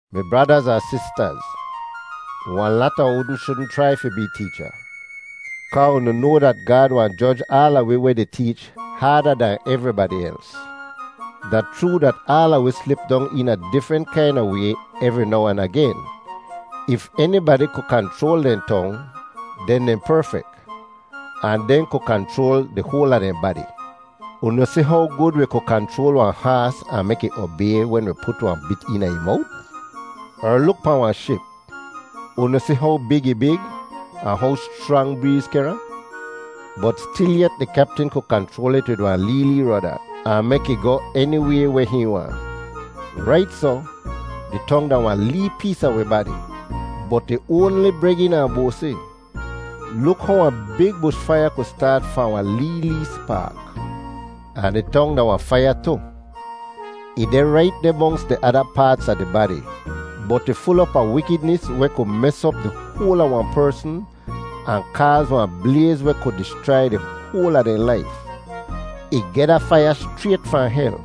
Mi bradaz ahn sistaz, wahn lata unu shudn chrai fi bee teecha, kaa unu noa dat Gaad wahn joj aala wi weh di teech haada dahn evribadi els. Da chroo dat aala wi slip dong eena difrent kaina way evri now ahn agen. If enibadi ku kanchroal dehn tong, den dehn perfek, ahn dehn ku kanchroal di hoal a dehn badi. Unu si how gud wi ku kanchroal wahn haas ahn mek ih obay wen wi put wahn bit eena ih mowt? Er luk pahn wahn ship. Unu si how big ih big, ahn how schrang breez kehr ahn? Bot stilyet di kyaptin ku kanchroal it wid wahn lee, lee roda, ahn mek ih goh eniway weh hihn waahn. Rait soh, di tong da wahn lee pees a wi badi, bot ih oanli bregin ahn boasi. Luk how wahn big bush faiya ku staat fahn wahn lee lee spaak. Ahn di tong da wahn faiya tu. Ih deh rait deh monks di ada paats a di badi, bot ih ful op a wikidnis weh ku mes op di hoal a wahn persn ahn kaaz wahn blayz weh ku dischrai di hoal a dehn laif. Ih geh da faiya schrayt fahn hel.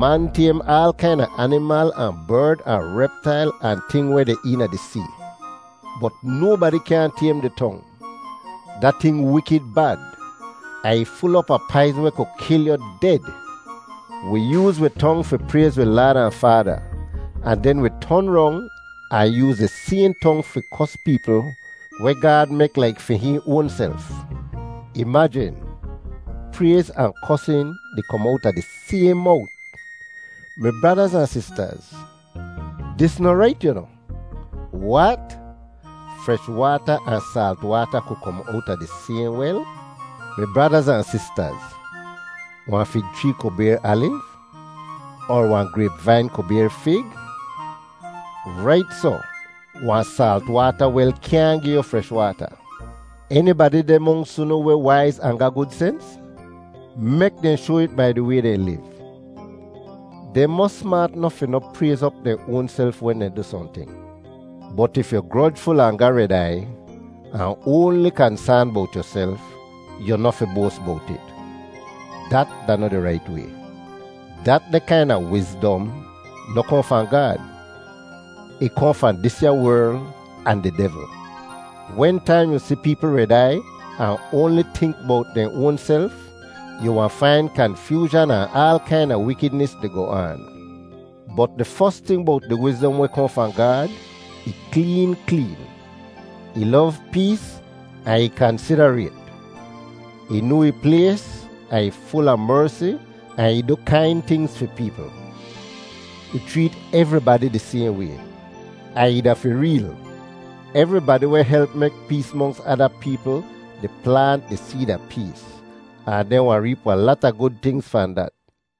Man taym aal kaina animal ahn berd ahn reptail ahn ting weh deh eena di see. Bot nobadi kyaahn taym di tong. Da ting wikid bad, ahn ih ful op a paizn weh ku kil yu ded! Wi yooz wi tong fi prayz wi Laad ahn Faada, ahn den wi ton rong ahn yooz di sayhn tong fi kos peepl weh Gaad mek laik fi hihn oanself. Imajin, prayz ahn kosin di kom owta di sayhn mowt! Mi bradaz ahn sistaz, dis noh rait, yu noh! Wat? Fresh waata ahn saalt waata ku kom owta di sayhn wel? Mi bradaz ahn sistaz, wahn fig chree ku bayr aliv, er wahn grayp-vain ku bayr fig? Rait soh, wahn saalt waata wel kyaahn gi yu fresh waata. Enibadi deh monks unu weh waiz ahn ga gud sens? Mek dehn shoa it bai di way dehn liv. Dehn mos smaat nof fi noh prayz op dehn oanself wen dehn du sohnting. Bot if yu grojful ahn ga red aiy, ahn oanli kansaan bowt yuself, yu noh fi boas bowt it. Dat da noh di rait way. Datdeh kaina “wizdom” noh kohn fahn Gaad. Ih kohn fahn disya werl ahn di devl. Wentaim yu si peepl red aiy ahn oanli tink bowt dehn oanself, yu wahn fain kanfyoozhan ahn aal kaina wikidnis di goh aan. Bot di fos ting bowt di wizdom weh kohn fahn Gaad, ih kleen kleen. Ih lov pees ahn ih kansidarayt; ih noa ih plays ahn ih ful a mersi ahn ih du kain tingz fi peepl. Ih chreet evribadi di sayhn way, ahn ih da fi reel. Evribadi weh help mek pees monks ada peepl di plaant di seed a pees, ahn dehn wahn reep wahn lata gud tingz fahn dat.